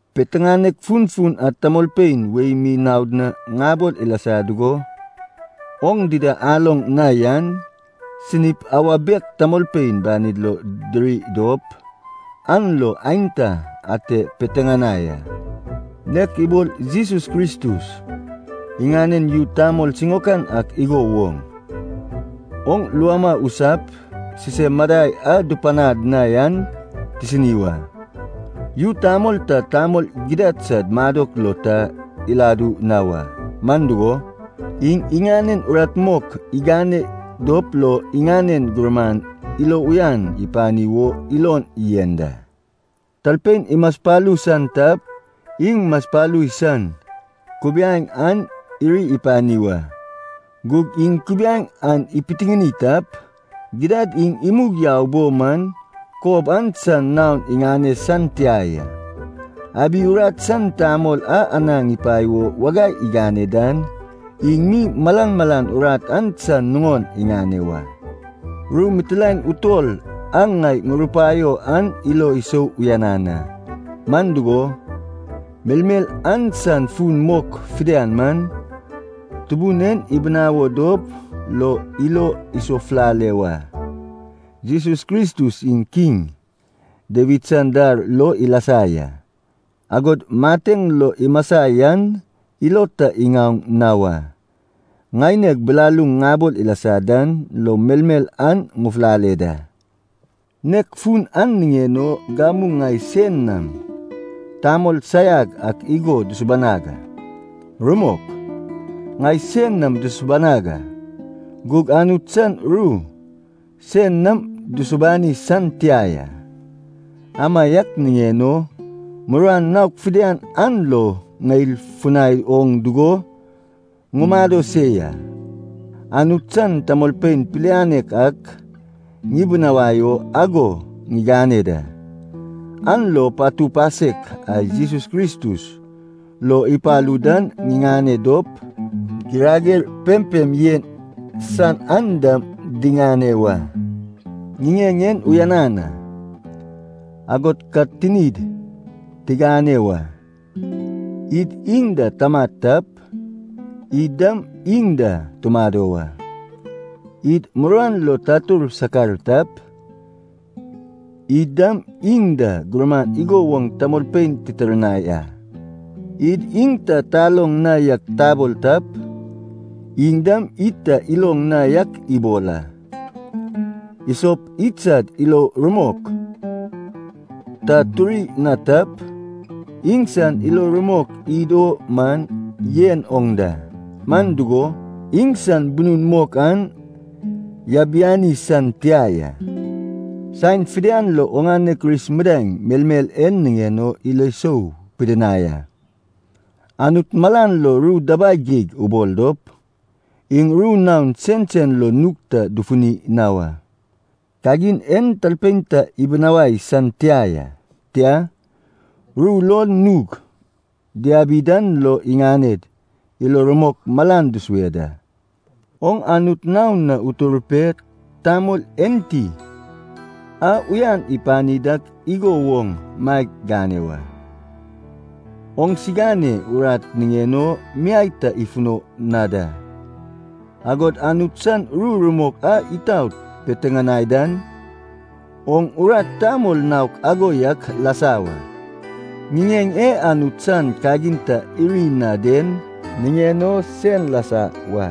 Piteŋanek funfun a tamolpein wei mi naod na ŋabol ilasa dugo, oŋ dida aloŋ na yan, sinip awa bek tamolpein banid lo diri dop, an lo aenta ate dipiteŋanai a. Nek ibol Jesus Kristus iŋanen yu tamol siŋaokan ak igo woŋ, oŋ luama usap sisem madai a dupanad na yan tisini wa. Yu tamol ta tamol gidad sad madok lo ta iladu na wa, man dugo, iŋ iŋanen urat mok igane dop lo iŋanen gurman ilo uyan ipani wo ilon yen da. Talpein imaspalu san tap, iŋ masapalu san kubiaeŋ an iri ipani wa. Gug iŋ kubiaeŋ an ipitiŋini tap, gidad iŋ imug yau bo man kob an san naon iŋane san tia ya. Abi urat san tamol a anaŋ ipae o wagai igane dan iŋ mi malan malan urat an san nuŋon iŋane wa. Ru mitilaen utol a ŋai ŋurupaio an ilo isou uyanan a. Man dugo, melmel an san fun mok fidian man, Tubun en ibinawo dop lo ilo isofulale wa. Jesus Kristus iŋ Kiŋ Dawid san dar lo ilasa ya, agod mateŋ lo imasa yan, ilo ta iŋaoŋ na wa. Ŋaineg bilaluŋ ŋabol ilasa dan lo melmel an ŋufulale da. Nek fun an niŋen o gamu ŋai sein nam tamol saiag ak igo dusubanag a. Rumok, ŋai sein nam dusubanag a, gug Anut san ru sein nam dusubani san tia ya. Amaiak niŋen o, muruan naok fidian an lo ŋeil funai oŋ dugo ŋumado se ya. Anut san tamolpein pilianek ak ŋibinawai o ago ŋigane da, an lo patu pasek a Jesus Kristus lo ipalu dan diŋane dop, girager pempem yen san an dam diŋane wa. Ŋiŋeŋ en uyanan a, agod ka tinid tigane wa. “Id iŋ da tamat tap, id dam iŋ da tumado wa. Id muruan lo tatur sakar tap, id dam iŋ da gurman igo woŋ tamolpein titirnai a. Id iŋ ta taloŋ na yak tabol tap, iŋ dam id ta iloŋ na yak ibol a. Isop idsad ilo rumok ta turi na tap, iŋsan ilo rumok id o man yen oŋ da. Man dugo, iŋsan bunun mok an yabiani san tia ya.” Saen fidian lo oŋane Kris midaeŋ melmel en niŋen o ilo sou pidinai a. Anut malan lo ru dabai geig ubol dop, iŋ ru naon sensen lo nug ta dufuni na wa. Kagin en talpein ta ibinawai san tia ya. Tia, ru lo nug diabi dan lo iŋaned ilo rumok malan dusue da. Oŋ Anut naon na utur pe tamol enti a uyan ipani dak igo woŋ maeg gane wa. Oŋsigane urat niŋen o miai ta ifuno na da, agod Anut san ru rumok a itaot piteŋanai dan, oŋ urat tamol naok ago yak lasa wa. Ŋiŋeŋ e Anut san kagin ta iri na den niŋen o sen lasa wa.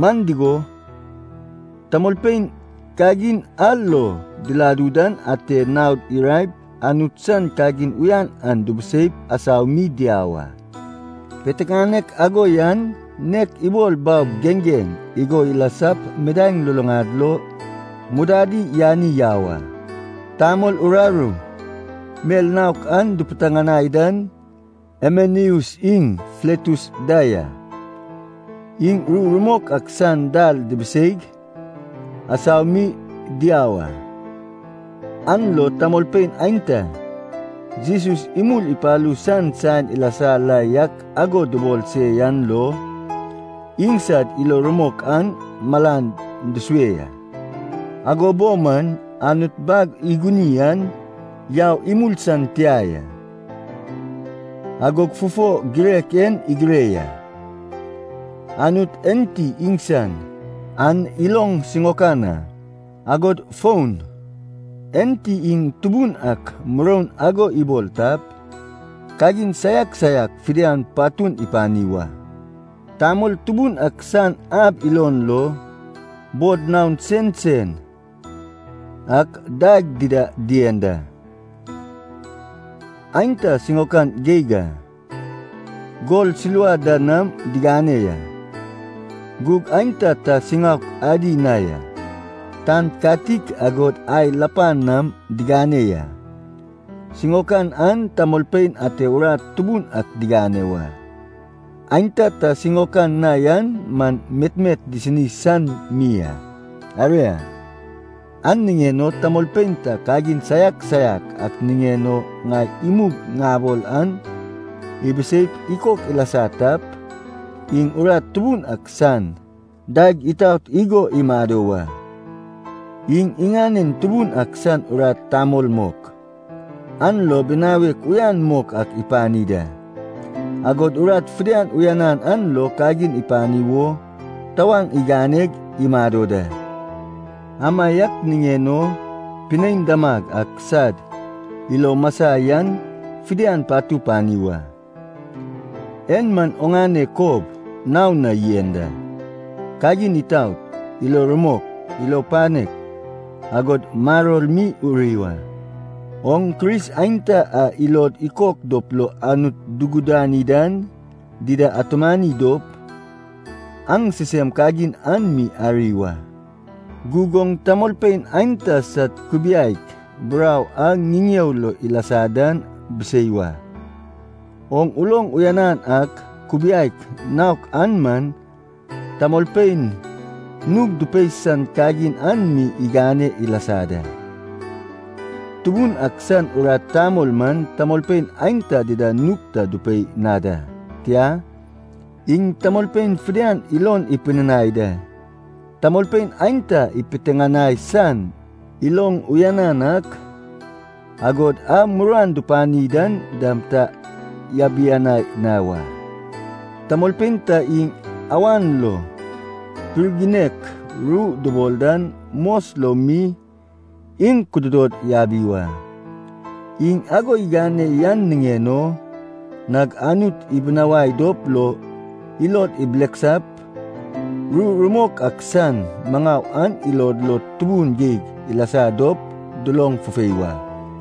Man dugo, tamolpein kagin a lo diladu dan ate naod iraep, Anut san kagin uyan an dubuseip asau mi diau a. Piteŋanek ago yan, nek ibol baob geŋgeŋ igo ilasap midaeŋ luluŋad lo mudadi yani yau a. Tamol uraru mel naok a dupiteŋanai dan Himeneus iŋ Filetus da ya. Iŋ ru rumok ak san dal dibiseig asau mi diau a. An lo tamolpein aenta, Jesus imul ipalu san saen ilasa la yak ago dubol se yan lo, iŋsad ilo rumok an malan dusue ya. Ago bo man, Anut bag iguni an yau imul san tia ya. Agog fufo girek en igire ya, “Anut enti iŋsan an iloŋ siŋaokan a.” Agod fon, “Enti iŋ Tubun ak muroun ago ibol tap, kagin saiak saiak fidian patun ipani wa.” Tamol tubun ak san ab ilon lo, bod naon sensen ak daeg dida dien da. Aenta siŋaokan geig a, gol silva da nam digane ya; gug aenta ta siŋaok adi na ya, tan katik agod ai lapan nam digane ya. Siŋaokan an tamolpein ate urat tubun ak digane wa. Aenta ta siŋaokan na yan man metmet disini san mi a. Aria, an niŋen o talpein ta kagin saiak saiak a niŋen o ŋai imug ŋabol an ibiseip ikok ilasa tap, iŋ urat tubun ak san daeg itaot igo imado wa. Iŋ iŋanen Tubun ak san urat tamol mok, an lo binawek uyan mok ak ipani da, agod urat fidian uyanan an lo kagin ipani wo tawaŋ iganeg imado da. Amaiak niŋen o pinein damag ak sad ilo masa yan fidian patu pani wa. En man oŋane kob nao na yen da: kagin itaot, ilo rumok, ilo panek, agod maror mi uri wa. Oŋ Kris aenta a ilod ikok dop lo Anut dugudani dan, dida atumani dop, aŋ sisem kagin an mi ari wa. Gug oŋ tamolpein aenta sad kubiaek burau a ŋiŋeo lo ilasa dan bisei wa. Oŋ uloŋ uyanan ak kubiaek naok an man tamolpein nug dupei san kagin an mi igane ilasa da. Tubun ak san urat tamol man tamolpein aenta dida nug ta dupei na da. Tia, iŋ tamolpein fidian ilon ipidinai da, tamolpein aenta ipiteŋanai san iloŋ uyanan ak, agod a muruan dupani dan dam ta yabianai na wa. Tamolpein ta iŋ awan lo pirginek ru dubol dan mos lo mi iŋ kududod yabi wa. Iŋ ago igane yan niŋen o nag Anut ibinawai dop lo ilod ibileksap, ru rumok ak san maŋau an ilod lo tubun geig ilasa dop duloŋ fufei wa.